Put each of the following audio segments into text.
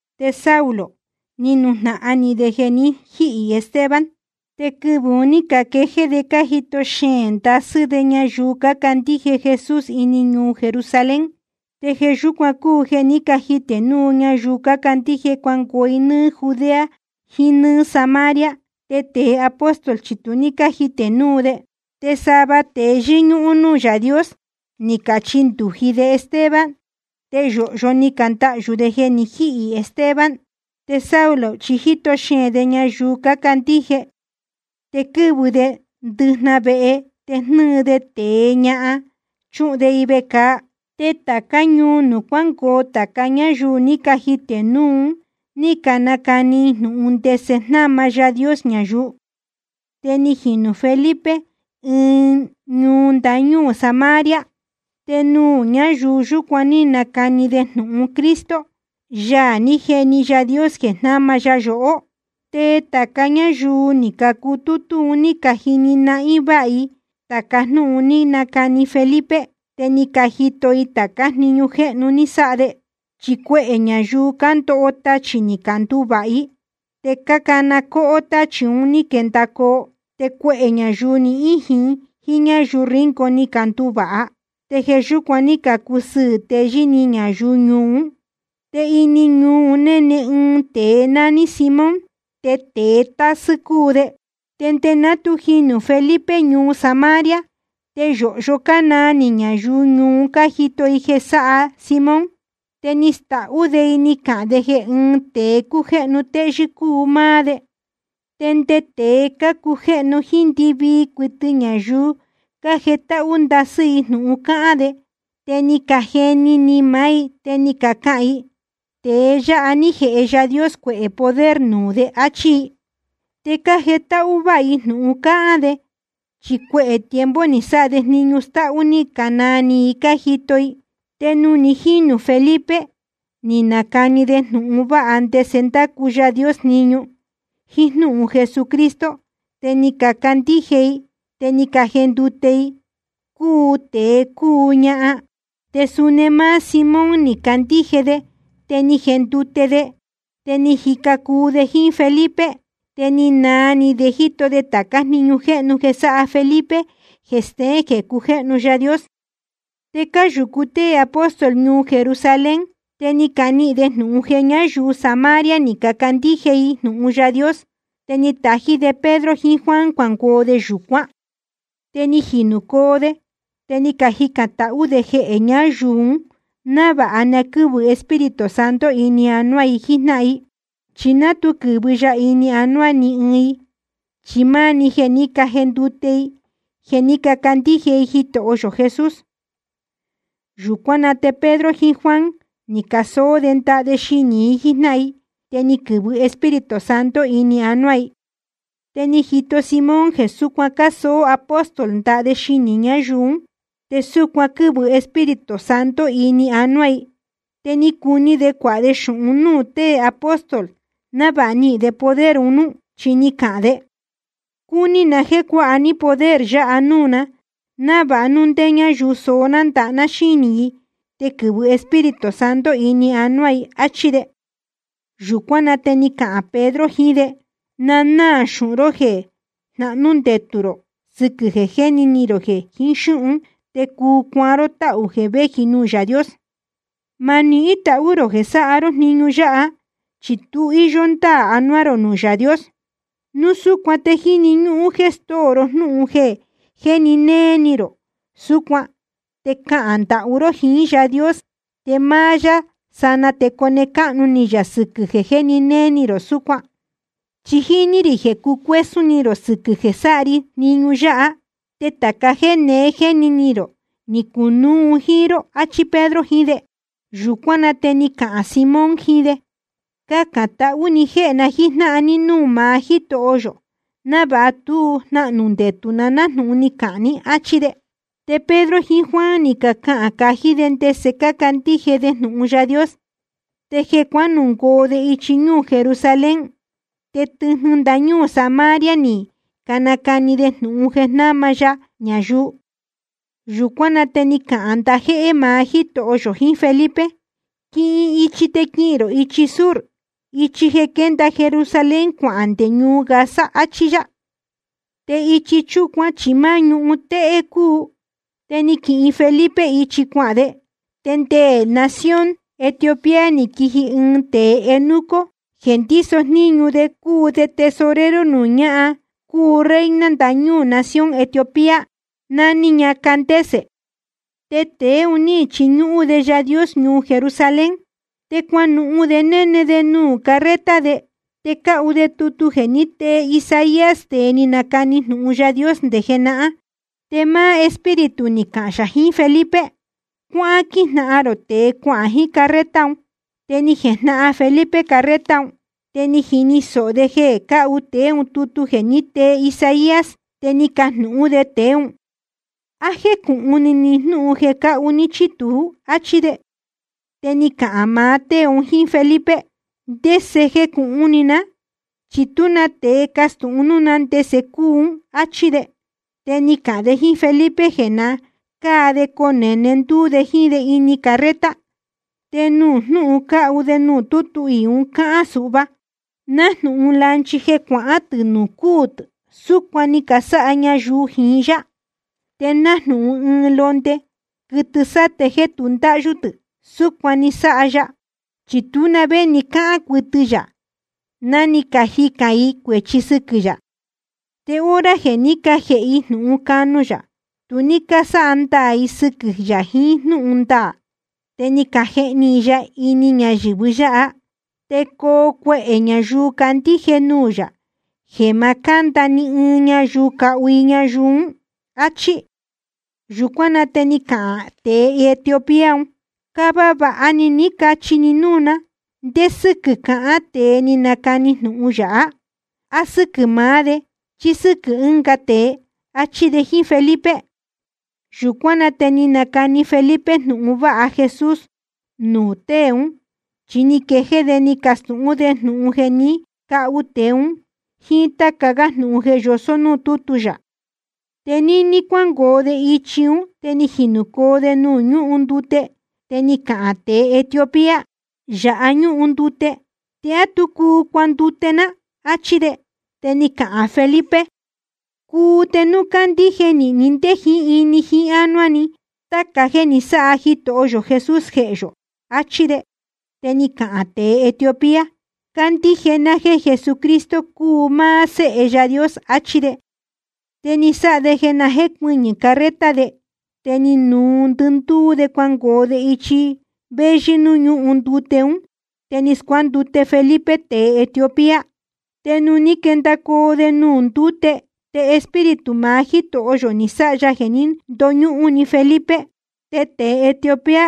Te Saulo, ni nujnahan ni de jeē ni jíhī Esteban. Te quɨvɨ̄ un ní caquejéé de cájito xeēn ndasɨ́ de ñayuu cácandíje Jesús ini ñuu Jerusalén, te jeē yúcuan cúu jeē ní cajitē núu ñayuu cácandíje cuangoo i nɨ́ɨ́ Judea jiín nɨ́ɨ́ Samaria. Te tēe apóstol chi tu ní cájitē núu de. Te sava tēe yɨ́ñúhún núū Yaā Dios, ni cachindūji de Esteban. Te yōhyo ni candahyū de jeē ni jíhī Esteban. Te Saulo chi jíto xeēn de ñayuu cácandíje, te quɨ́vɨ de ndɨjnahan vehe te jnɨ́ɨ de tēe, ñahan, chúhun de i vecāa. Te tācá ñuu nuū cuángoo tāca ñáyuu ní cajitē núu un ní canacani i jnūhun ndese jnáma Yaā Dios ñayuu. Te ni jinū Felipe ɨɨn ñuu ndañúū Samaria, te nuū ñáyuu yúcuan ní nacani de jnūhun Cristo, Yaā ní jeni Yaā Dios jeē jnáma ya yohó. Te tāca ñáyuu ní cacutútú un ní cajini nahín váha i tāca jnúhun ni nacani Felipe, te ni cajito i tācá jniñu jéhnu ni sáha de. Chi cuehē ñayuu cándoho tachī ni canduvāha i, te cácana cóhó táchī un ní caquendacoo. Te cuehē ñayuu ni íjin jíín ñáyuu ríngo ni canduvāha. Te jeē yúcuan ní cacusɨɨ̄ teyɨ́ ni ñayuu ñuu ún. Te ini ñuu un néne ɨɨn tēe nání Simón, te tēe tásɨ́ cúu de. Te nde ná tu jinū Felipe ñuu Samaria, te yōhyo cánaa ni ñayuu ñuu un cájito i jeē sáha Simón, te ni stahú de i ni cahān de jeē ɨ́ɨn tēe cújéhnu téyɨ́ cúu máá de. Te nde tēe cácujéhnu jíín ndɨvii cuɨtɨ ñayuu, cájetáhú ndasɨ́ i jnūhun cáhán de, te ni cajeni ni maá i te ni cacahān i: Tēe yáha ní jēhe Yaā Dios cuehē poder nuū de, áchí i. Te cájetáhú váha i jnūhun cáhán de, chi cuehē tiempo ni sáha de jniñu stáhú ní canaa ni i ni cajito i. Te nuū ni jínū Felipe, ni nacani de jnūhun vāha ndese ndácu Yaā Dios jniñu, jíín jnúhun Jesucristo, te ni cacandíje i te ni cajendute i, cúu tēe cúu ñahan. Te suni máá Simón ni candíje de te ni jendute de, te ni jica cuu de jíín Felipe. Te ni naa ni de jíto de tācá jniñu jéhnu jeē sáha Felipe jeē steén jeē cujéhnu Yaā Dios. Te cáyūcu tée apóstol ñuu Jerusalén, te ni canihīn de jnūhun jeē ñáyuu Samaria ni cacandíje i jnūhun Yaā Dios. Te ni catají de Pedro jiín Juan cuangoo de yūcuán. Te ni jinūcoo de, te ni cajicān tahú de jehē ñáyuu un návāha na quɨ́vɨ Espíritu Santo ini anuá i jíjnáhan i. Chi ná tu quɨ̄vɨ ya ini anuá ni ɨɨn i, chi máá‑ni jeē ní cajendute i jeē ní cacandíje i Jitoho yō Jesús. Yūcuán na te Pedro jiín Juan ni casoó de ndaha de xinī i jíjnáhan i, te ni quɨ̄vɨ Espíritu Santo ini anuá i. Te ni jito Simón jeē súcuan cásoó apóstol ndaha de xinī ñáyuu ún te súcuan quɨ́vɨ Espíritu Santo ini anuá i, te cúní de cuāha de xūhun núū tée apóstol návāha nihīn de poder un núú. Chi ni cahān de: Cúní na jéē cuāha ní poder yáha núū na, návāha núu ndé ñáyuu soó ná ndaha ná xínī i te quɨ̄vɨ Espíritu Santo ini anuá i, áchí de. Yūcuán na te ni cahān Pedro jiín de: Na náā xūhun ró je jnahnū ndetū rō sɨquɨ̄ jeē jéni ni rō jeē jiín xúhun te cuu cuaan ró táhū jeē véji nuū Yaā Dios. Ma nihín tahú rō jeē sáha ró jniñu yáha, chi tu íyó ndáā anuá rō nuū Yaā Dios. Núu súcuan te jíni ñúhún jéē stóo rō jnúhun jeē jéni néé ni rō súcuan te cahān ndahú ró jiín Yáā Dios, te máá yá sanaa te cone cáhnu ni yā sɨquɨ̄ jeē jéni néé ni rō súcuan. Chi jíní rī jeē cucuésún ni rō sɨquɨ̄ jeē sáha ri jniñu yáha. Te tāca jéē neé jéni ni rō ni cunuú un jíín ró, achí Pedro jiín de. Yūcuán na te ni cahān Simón jiín de: Cacān tahú ni jéhē na jíjnáhan ní núū maá Jítoho yō návāha tú jnahnū ndetū na nájnūhun ni cahān ní, áchí de. Te Pedro jiín Juan ni cacahān cají de ndese cácandíje de jnūhun Yaā Dios. Te jeē cuánungoo de ichi ñúū Jerusalén, te tɨjnɨ ndañúū Samaria ni canacani de jnūhun jeē jnáma ya ñayuu. Yūcuán na te ni cahān ndajéhé maá Jítoho yō jiín Felipe: Quihin ichi te quihīn rō ichi sur, ichi jeē quénda Jerusalén cuahān nde ñuu Gaza, áchí yá. Te ichi chúcuan chi máá ñuhun téhé cúu. Te ni quihin Felipe ichi cuahān de. Te nde nación Etiopía ni quiji ɨɨn tēe eunuco jeē ndíso jníñu de cúu de tesorero nuū ñáhan cúu reina ndácu jniñu nación Etiopía, nání ña Candace. Tēe un ní quichiñúhún de Yaā Dios ñuu Jerusalén. Te cuanuhun de néne de nuū carreta de, te cáhu de tutu jeē ní tee Isaías, tēe ni nacani jnūhun Yaā Dios nde jenahán. Te máá Espíritu ni cahān yā jiín Felipe: Cuáhán quíjnahan rō tēe cuahān jiín carreta un. Te ni jejnahan Felipe carreta un, te ni jini sōho de jeē cáhu tēe ún tutu jeē ní tee Isaías. Te ni cajnūhún de tēe ún: ¿A jécūhun ni ni jnúhun jeē cáhu ní chí tuú? áchí de. Te ni cahān maá tée un jíín Felipe: ¿Te ndese jecūhun ni ná? Chi tú na tēe castūhun núū ná ndese cúu ún, áchí de. Te ni cahān de jíín Felipe jeē na cáa de conēne ndúú de jíín de ini carreta. Te jnūhun cáhu de tutu iī un cáhán suhva: Nájnūhun lanchi jeē cuahán tɨ̄ nuū cúū tɨ̄, súcuan ni casáha ñayuu jiín yá. Te nájnūhun ɨɨn londe quɨtɨ sáte jéē tu ndáhyú tɨ̄, súcuan ni sáha ya, chi tú na vé ni cáhán cuɨtɨ yā ná ni cajicān i cuēchi sɨquɨ̄ yā. Te hora jeē ní cajēhe i jnūhun canu yā, tu ní cásáha ndaā i sɨquɨ̄ yā jiín jnúhun ndaā, te ni cajehni i ya ini ñayɨ̄vɨ yáha. Te coo cuehē ñayuu candíje nuū yā jeē ma cánda ni ɨɨn ñayuu cahu i ñayuu ún. Achí. Yūcuán na te ni cahān tēe Etiopía un: Cava vāha ni ní cachi ni núū ná, ¿ndé sɨ́quɨ̄ cahán tēe ni nacani jnūhun yáha? ¿A sɨ́quɨ̄ maá de chí sɨ́quɨ̄ ɨ́nga tēe? áchí de jíín Felipe. Yūcuán na te ni nacani Felipe jnūhun vāha Jesús nuū tée ún, chi ni quejéé de ni castūhún de jnūhun jeē ní cahu tēe ún, jíín táca gá jnūhun jeē yosó núū tútu yā. Te níní cuángoo de ichi ún te ni jinūcoo de nuū ñúhun ndute, te ni cahān tēe Etiopía: Yāha ñúhun ndute ¿te á tú cuu cuandute ná? áchí de. Te ni cahān Felipe: Cuu te núu cándíje nīhin ni ndé jiín ini jiín ánuá ni táca jéē ni sáha Jitoho yō Jesús jehē yō, achí de. Te ni cahān tēe Etiopía: Cándíje ná jéē Jesucristo cúu máá Séhe Yaā Dios, achí de. Te ni sáha de jeē na jécuɨñɨ̄ carreta de, te ni nuu ndɨndúú de cuangoo de ichi véyɨ́ núū ñúhun ndute ún, te ni scuándute Felipe tēe Etiopía. Te nuū ní quendacoo de nuū ndúte, te Espíritu maá Jítoho yō ni sáha ya jeē ní ndoñúhún‑ni Felipe. Te tēe Etiopía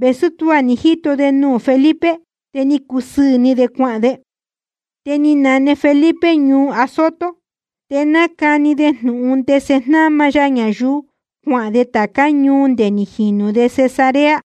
vēsú tuá ni jíto de nuū Felipe, te cúsɨɨ̄ ni de cuahān de. Te ni nane Felipe ñuu Azoto. Te nácani de jnūhun ndese jnáma ya ñayuu, cuahān de tācá ñuu nde ni jinū de Cesarea.